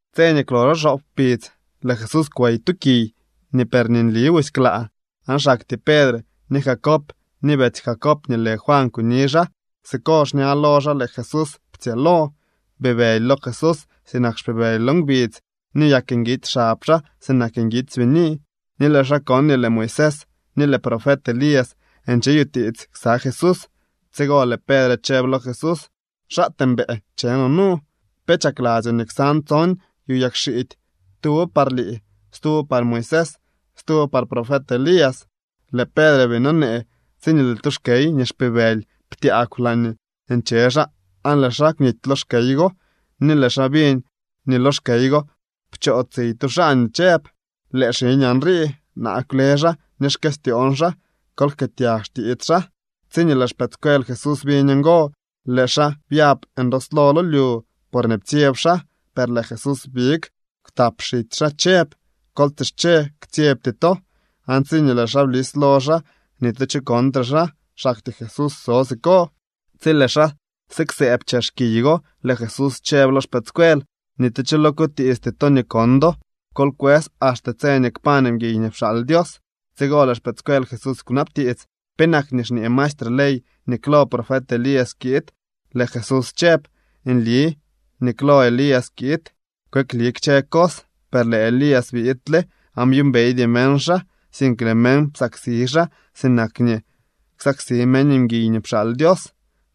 Tse nii kwloxo xoop kpidz, lëë Jesús kwey tu kiy nii per nli busy klaa, aan xaktyee Pedre, ni Jacob, ni betsy Jacob nii lë Juan kuni xaa. Siko xña lo xaa lëë Jesús ptsyëëlo. Bibëly lo Jesús sinak xpibëly lo ngbidz ni byak nguitsy xab xaa sinak nguitsy bini. Ni lëë xaa kon nii lëë Moisés ni lëë profet Elías ncheyutiits ksa Jesús. Tsigo lëë Pedre chëb lo Jesús: —¡Xaatee mbëë nche no nu! Pe chakladzyoo nii ksan tson yu yagxiidy, tuwo par lii, stuwo par Moisés, stuwo par profet Elías. Lëë Pedre bii nonee, tsiñee lëë tu xkey nii xpibëly ptyaagw laañee nche xaa aan lëë xaa kwnity lo xkey go ni lëë xaa biñ nii lo xkey go pchootsiy tu xaa nii chëb: —Lëë xiñaa nrii. Naa kwle xaa ni xkëstyoon xaa. Kol jkëëtyag xtiits xaa. Tsiñee lëë xpëëdscuel Jesús biñ ngo, lëë xaa byab ndooslo lo lyu porñee ptsyeb xaa. Per lëë Jesús big kwtap xitsy xaa chëb: —Kol tsische. Ktsyebty to. Aan tsiñee lëë xaa blis lo xaa, ni tu cho kontre xaa, xaktyee Jesús so siko. Tsi lëë xaa siksëëb chex kiy go, lëë Jesús chëb lo xpëëdscuel: —Ni tu cho lo kutiisty to nii kon do. Kol kwës axte tse nii kpañ mguiy nii pxaal Dios. Tsigo lëë xpëëdscuel Jesús kwnabtiits: —¿Penak nii xñee maestre ley nii klo profet Elías kiid? Lëë Jesús chëb: —Nli nii klo Elías kiid kweekli kchë cos. Per lëë Elías biidle, aan byuumbeydy meñ xaa, sink lëë meñ psaksi xaa sinak nii ksaksi meñ mguiy nii pxaal Dios.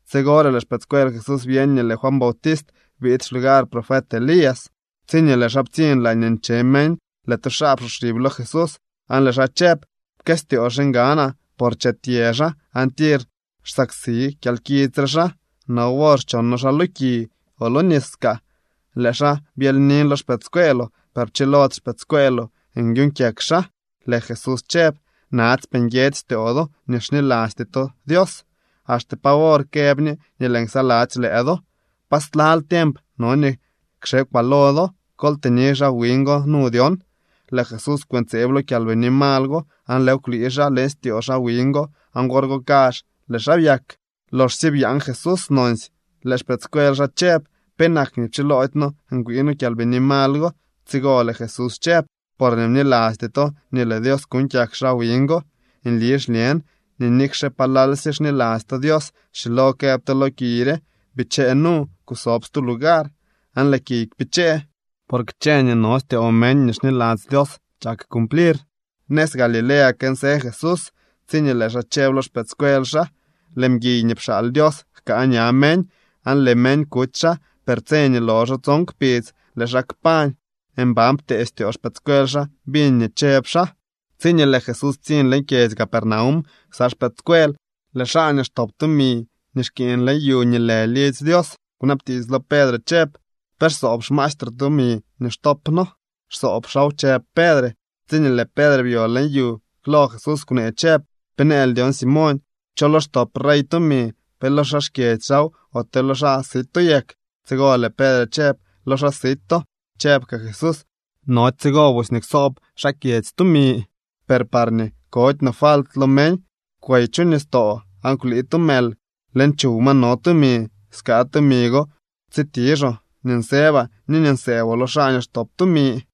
Tsigore lëë xpëëdscuel Jesús byeñ nii lëë Juan Bautist biid xlugar profet Elías. Tsiñee lëë xaa ptsiñ laañee nche meñ, lëë tu xaa psoxib lo Jesús aan lëë xaa chëb: —Pkëstyoo xiñganaa, por chetyë xaa aan tir xsaksi kyalkits re xaa. No wor xchono xaa lo ki o lo nis kaa. Lëë xaa byelynin lo xpëëdscueeloo, per pchilody xpëëdscueeloo nyuñ kyak xaa. Lëë Jesús chëb: —¡Natsypee nguiedzy styoo do ni xnilasty to Dios! ¿Axte pa wor këb ñe nii lëën ksaladzy lëë do? ¿Pa slal tiemp no nii kxekwaa lo do? Kol tëni xaa wiñ go nu dyon. Lëë Jesús kwëntseeb lo kyalbini mal go aan lëëw kwlii xaa leñ styoo xaa wiñ go aan wor go kazh lëë xaa byak. Loxsye byaan Jesús nonsy, lëë xpëëdscuel xaa chëb: —¿Penak nii pchiloody noo ngwii noo kyalbini mal go? Tsigo lëë Jesús chëb: —Porñee bnilasty to nii lëë Dios kuuñ kyak xaa wiñ go. Nli xñen nii nikxe palalsye xniladzy to Dios schilo këb to lo kiy re: “Bichee nu, kusob stu lugar”, aan lëë kiy kpichee. Por kchë nii no styoo meñ nii xniladzy Dios chak cumplir. Nëz Galilea kënsë Jesús tsiñee lëë xaa chëb lo xpëëdscuel xaa: —Lëë mguiy nii pxaal Dios jkaa ña meñ. Aan lëë meñ kuty xaa, per tse nii loxo tson kpidz, lëë xaa kpañ. Mban ptee styoo xpëëdscuel xaa biñ nii chëb xaa. Tsiñee lëë Jesús ptsiñ leñ kyedzy Capernaum ksa xpëëdscuel, lëë xaa nii xtop tumi nii xkiiñ leñ yu nii lë lidzy Dios kunabtiits lo Pedre chëb: —¿Pe xsoob xmaestroo tumi nii xtop noo? —Xsoob xaaw —chëb Pedre. Tsiñee lëë Pedre byo leñ yu, klo Jesús kwnee chëb: —¿Pe nëël dyon, Simoñ? ¿Cho lo xtop rey tumi: pe lo xaa xkyedzy xaaw, ote lo xaa sito yak? Tsigo lëë Pedre chëb: —Lo xaa sito. Chëb kaa Jesús: —Nody tsigo busy nii ksoob xaa xkyedzy tumi. Per parñee kody no falt lo meñ, kwey chu nistoo aan kwlii tu mël. Leñ chuw ma no tumi. Skaa tumi go tsitixoo nii nsëbaa ni nii nsëëboo lo xaa nii xtop tumi.